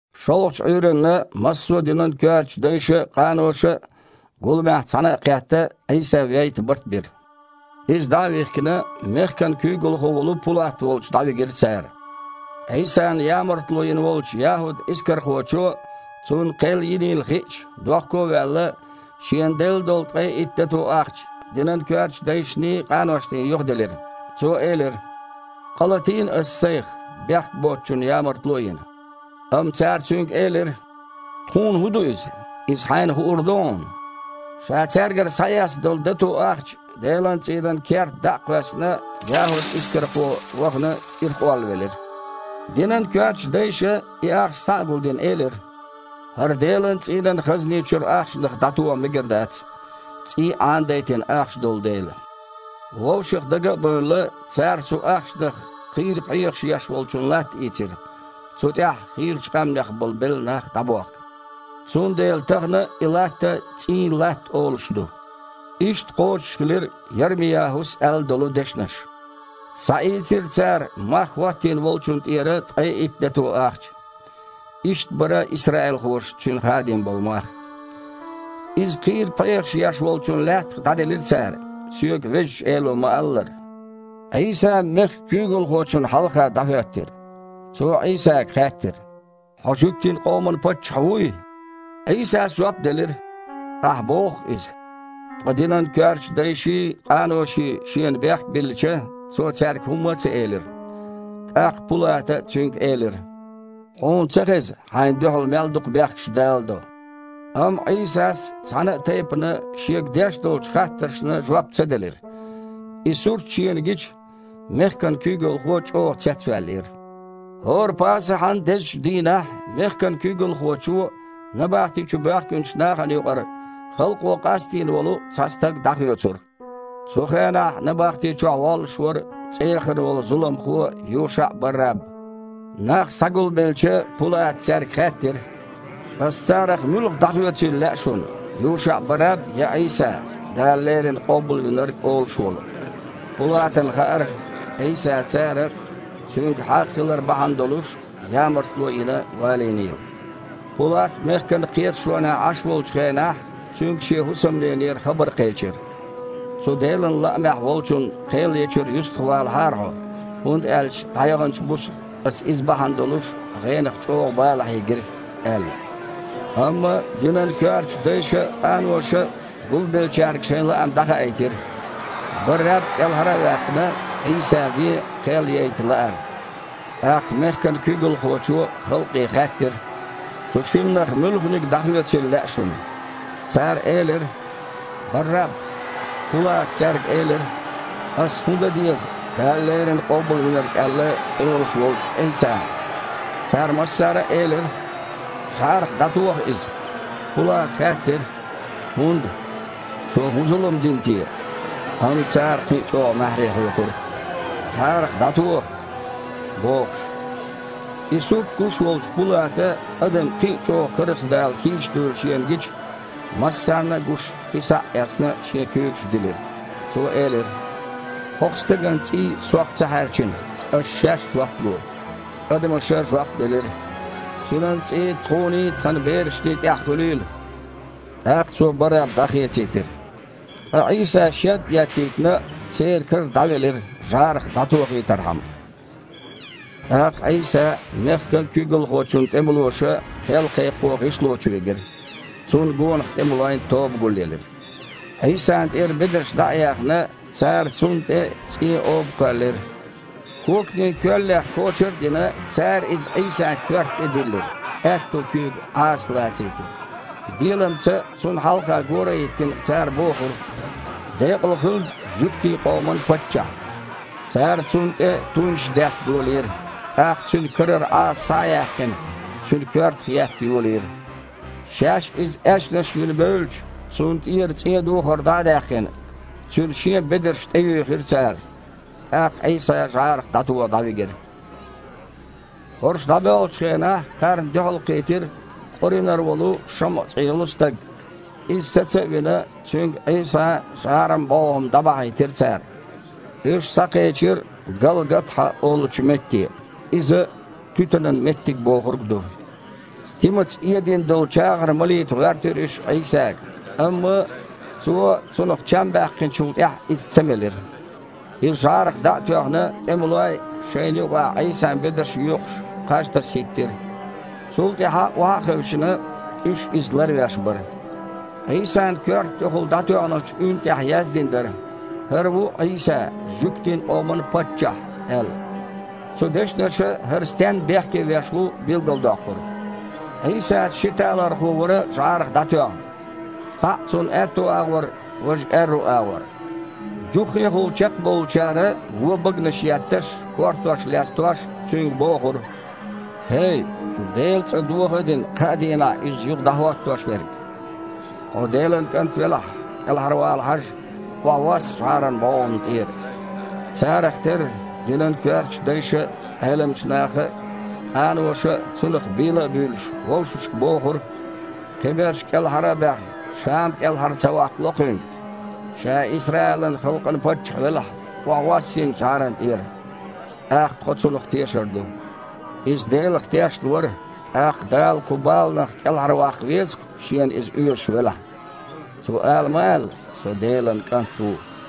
ШолгІачу Іуьйранна массо а динан коьртачу дайша а, къаноша а гуламехь, цхьаьна а кхетта, Іийса вейта барт бира. Иза, дІа а вихкина, мехкан куьйгалхо волу Пулат волчу дІавигира цара. Іийсана ямартло йина волчу ЯхІуд-Искархочо, Цунна кхел йинийла хиъча, дохко а ваьлла, шена делла долу ткъе итт дато ахча динан коьртачу дайшний, къаношний юхаделира. Цо элира: «Къа латийна аса сайх, бехк боцучунна ямартло а йина». Амма цара цуьнга элира: «Тхуна хІун ду иза? Иза хьайна хуур ду хьуна». Ша цаьргара схьаэцна долу дато ахча Делан цІийнан керта дІа а кхоьссина, ЯхІуд-Искархо, вахана, ирхъоллавелира. Динан коьртачу дайша, и ахча схьа а гулдина, элира: «ХІара Делан цІийнан хазни чуьра ахчанах дІатоха мегар дац, цІий Іанадайтина ахча долу дела». Вовшах дага а бевлла, цара цу ахчанах кхийра пхьегІаш еш волчун латта ийцира, цу тІехь хийрачу къаьмнех болу белла нах дІабохка. Цундела тахана а и латта «ЦІийн латта» олуш ду. Иштта кхочушхилира Ярми-ЯхІус аьлла долу дешнаш: «Схьаийцира цара мах хІоттийна волчунна тІера ткъе итт дато ахча. Иштта бара исраилхоша цуьнан хадийна болу мах. Иза кхийра пхьегІаш еш волчун лаьттах дІаделира цара, соьга Везачу Эло ма-аллара». Іийса мехкан куьйгалхочунна хьалха дІахІоьттира. Цо Іийсага хаьттира: «Хьо жуьгтийн къоман паччахь вуй?» Іийсас жоп делира: «Ахьа боху-кх иза». Ткъа динан коьртачу дайший, къаноший Шена бехк биллича, Цо цаьрга хІумма а ца элира. ТІаккха Пулата Цуьнга элира: «Хьуна ца хеза, Хьайна дуьхьал мел дукха бехкаш даладо?» Амма Іийсас цхьана а тайпана Шега деш долчу хаттаршна жоп ца делира. И сурт шена гича, мехкан куьйгалхо чІогІа цецваьллера. ХІора Пасахьан дезачу дийнахь мехкан куьйгалхочо набахти чу боьхкинчу нахана юкъара халкъо къастийна волу цхьа стаг дІахоьцура. Цу хенахь набахти чохь воллуш вара цІеяхана волу зуламхо ЮшаІ-Барраб. Нах схьагулбелча, Пулата цаьрга хаьттира: «Аса царах муьлха дІахоьцийла лаьа шуна: ЮшаІ-Барраб я Іийса, „ Дала леррина Къобалвинарг“ олуш волу?» Пулатана хаьара, Іийса цара, Цуьнга хьагІ хилар бахьана долуш, ямартло а йина, валийнийла. Пулат мехкан кхеташонехь Іаш волчу хенахь цуьнга шен хІусамненера хабар кхечира: «Цу Делан лаамехь волчунна кхел ечуьра юьстахвалахьара хьо, хІунда аьлча дІаяханчу буса аса Иза бахьана долуш гІенах чІогІа бала хьийгира», – аьлла. Амма динан коьртачу дайша а, къаноша а гулбеллачаьрга шайн лаам дІахаийтира: Барраб кІелхьара а ваьккхина, Іийса вен кхел яйта лаар. ТІаккха мехкан куьйгалхочо халкъе хаьттира: «Цу шиннах муьлханиг дІахоьцийла лаьа шуна?» Цара элира: «Барраб». Пулата цаьрга элира: «Аса хІун дан деза, Дала леррина Къобалвинарг аьлла, цІе йолуш волчу Іийсана?» Цара массара а элира: «ЖІарах дІатоха Иза!» Пулата хаьттира: «ХІунда? Цо хІун зулам дина те?» Амма цара кхин а чІогІа маьхьарий хьоькхура: «ЖІарах дІатоха!» – бохуш. И сурт гуш волчу Пулата, адам кхин а чІогІа карзахдала кийча дуйла шена гича, массарна а гуш хи схьа а эцна, шен куьйгаш дилира. Цо элира: «ХІокху Стеган цІий сох ца хьаьрчина. Аш-шаьш жоп ло». Адамаша жоп делира: «Цуьнан цІий тхуний, тхан берашний тІехь хуьлийла!» ТІаккха цо Барраб дІахецийтира, ткъа Іийса, шед а еттийтина, церан кара дІавелира жІарах дІатохийтархьама. ТІаккха Іийса мехкан куьйгалхочун тІемалоша кхел кхайкхо гІишло чу вигира. Цунна гонах тІемалойн тоба гулъелира. Іийсана тІера бедарш дІа а яьхна, цара Цунна тІе цІен оба кхоьллира. Коканийн коьллех кочар а дина, цара иза Іийсан коьрта тІе диллира, аьтту куьйга Іаса лацийтира. Беламца, Цунна хьалха гора а хІиттина, цара бохура: «Декъала хуьлда жуьгтийн къоман Паччахь!» Цара Цунна тІе туйнаш детта долийра, тІаккха Цуьнан карара Іаса, схьа а яьккхина, Цуьнан коьртах етта йолийра. Шаьш Иза аьшнаш вина бевлча, Цунна тІера цІен духар дІа а даьккхина, Цуьнан Шен бедарш тІеюьйхира цара. ТІаккха Іийса жІарах дІатоха дІавигира. ХІорш дІабоьлхучу хенахь кхарна дуьхьал кхийтира Къуринара волу ШамІа цІе йолу стаг. Иза саца а вина, цуьнга Іийсан жІаран бІогІам дІабахьийтира цара. Уьш схьакхечира «Галгатхьа» олучу метте (иза «туьтанан меттиг» бохург ду). Стимаца эдина долу чагІар малийта гІоьртира уьш Іийсага, амма Цо, цунах чам баьккхинчул тІаьхьа, иза ца мелира. Иза жІарах дІа а тоьхна, тІемалой, шайна юкъахь Іийсан бедарш йоькъуш, кхаж таса хІиттира. Цул тІаьхьа, охьа а хевшина, уьш Иза ларвеш бара. Іийсан коьрта тІехула дІатоьхначу уьнна тІехь яздина дара: «ХІара ву Іийса, жуьгтийн къоман Паччахь» – аьлла. Цу дешнаша ХІара стенна бехке веш ву билгалдоккхура. Іийсаца ши талорхо вара жІарах дІатоьхна. Цхьаъ Цунна аьтту агІор, важа аьрру агІор. Юххехула чекхбовлучара вон баганаш етташ, кортош лестош, Цуьнга бохура: «ХІей, Делан цІа доха а дина, кхаа дийнахь иза юха дІахІоттош верг! Хьо Делан КІант велахь, кІелхьарвала хьажа, охьавосса жІаран бІогІамна тІера!» Царах терра динан коьртачу дайша а, Іеламчу наха а, къаноша а, Цунах бийла а буьйлуш, вовшашка бохура: «Кхиберш кІелхьара а баьхна, Ша-м кІелхьара ца ваккхало Кхуьнга. Ша Исраилан халкъан паччахь велахь, охьавосса хІинца жІарана тІера. ТІаккха тхо Цунах тешар ду! Иза Делах тешна вара, тІаккха Дала кху баланах кІелхьарваккха веза-кх, Шена Иза оьшуш велахь. Цо ала ма аьлла: „Со Делан КІант ву!“»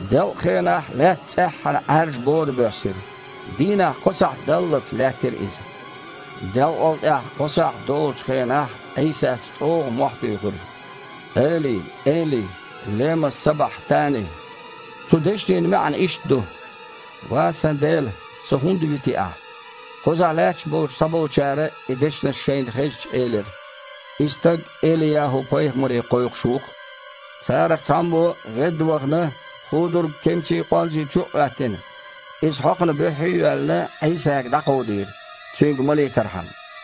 Делкъахенахь лаьтта цІеххьана Іаьржа бода боьссира. Дийнахь кхо сахьт даллалц лаьттира иза. Делкъал тІаьхьа кхо сахьт долучу хенахь Іийсас чІогІа мохь туьйхира: «Эли, Эли, лема сабахьтани?» Цу дешнийн маьІна иштта ду: «Ва Сан Дела! Со хІунда вити Ахьа?» Кхузахь лаьтташ болчу цхьаболчара, и дешнаш шайна хезча, элира: «И стаг Эли-ЯхІу-пайхамаре кхойкхуш ву-кх!» Царах цхьаммо, ведда вахана, худург кемсийн къонзи чу а Іоьттина, иза хьокхана буьххье а йоьллина, Іийсага дІакховдийра, Цуьнга малийтархьама.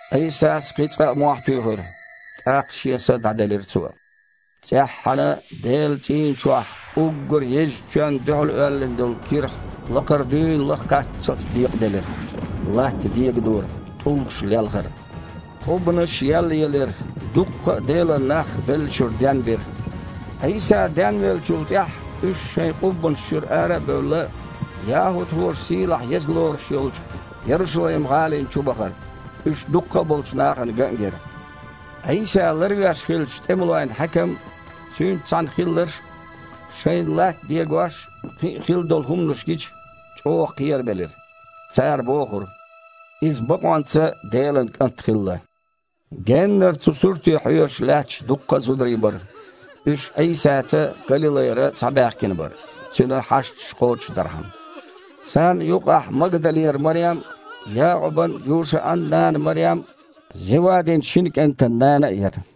Іийсас кхин цкъа а мохь туьйхира. ТІаккха Шен Са дІаделира Цо. ЦІеххьана Делан цІийна чохь уггар езачу чоьнна дуьхьал оьллина долу кирхьа лакхара дуьйна лаха кхаччалц декъаделира. Латта дегадора, тІулгаш лелхара. Къуббанаш еллаелира, дуккха а Делан нах беллачуьра денбира. Іийса денвеллачул тІаьхьа, уьш, шайн къуббанаш чуьра ара а бевлла, яхІудхоша сийлахь-еза лоруш йолчу Ярушалайм-гІалина чу бахара, уьш дуккха а болчу нахана ган а гира. Іийса ларвеш хиллачу тІемалойн хьаькам а, цуьнца цхьаьна хилларш а, шайна латта дегош а, кхин а хилла долу хІуманаш гича, чІогІа кхерабелира. Цара бохура: «Иза бакъонца Делан КІант хилла!» Геннара цу суьрте хьоьжуш лаьтташ дуккха а зударий бара. Уьш Іийсаца Галилайра схьабаьхкина бара, Цуьнан хьашташ кхочушдархьама. Царна юкъахь Магдалера Марем а, Якъубан а, Юшан а нана Марем а, Зевадин шина кІентан нана а яра.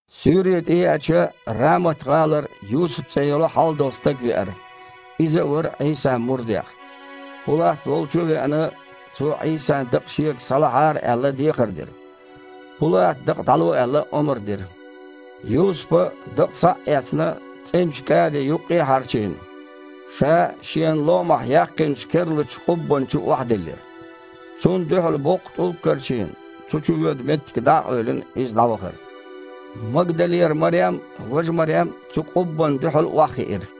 Суьйре тІееача, Рамат-гІалара Юсуп цІе йолу хьалдолу стаг веара. Иза а вара Іийсан мурдех. Пулат волчу а веана, цо, Іийсан дакъа шега схьалахьара аьлла, дехар дира. Пулата, дакъа дІало аьлла, омра дира. Юсупа, дакъа схьа а эцна, цІеначу кІади юккъе а хьарчийна, ша шена ломахь яьккхинчу керлачу къуббанна чу охьадиллира. Цунна дуьхьал боккха тІулг а карчийна, цу чу воьду меттиг дІа а къевлина, иза дІавахара. Магдалера Марем а, важа Марем а цу къуббанна дуьхьал охьахиира.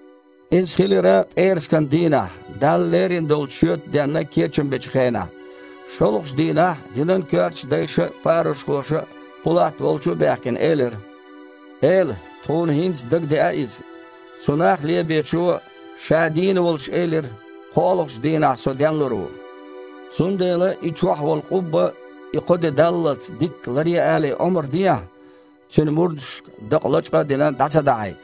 Иза хилира пІерасканан дийнахь, Далла лерина долчу шоьтан денна кечам бечу хенахь. ШолгІачу дийнахь динан коьртачу дайша а, парушхоша а, Пулат волчу а баьхкина, элира: «Эла, тхуна хІинца дагадеа иза: цу нах лебечо ша дийна волуш элира: „КхоалгІачу дийнахь Со денлур ву“. Цундела, и чохь волу къубба, и кхо де даллалц, дикка ларъе алий, омра дехьа, Цуьнан мурдашка дакъа, лачкъа а дина, дІа ца дахьийта.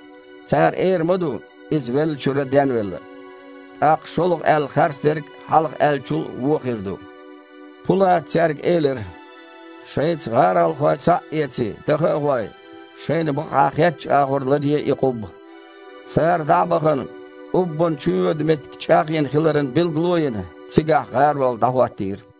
Цара эр ма ду: „Иза веллачуьра денвелла“. ТІаккха шолгІа аьлла харцдерг хьалха аьллачул а вон хир ду». Пулата цаьрга элира: «Шайца гІаролхой схьа а эций, даха а гІой, шайна бакъахьа хеттачу агІор ларъе и къубба». Цара, дІа а бахана, къуббанна чу воьду меттиг чІагІйина хиларан билгало а йина, цигахь гІарол дІахІоттийра.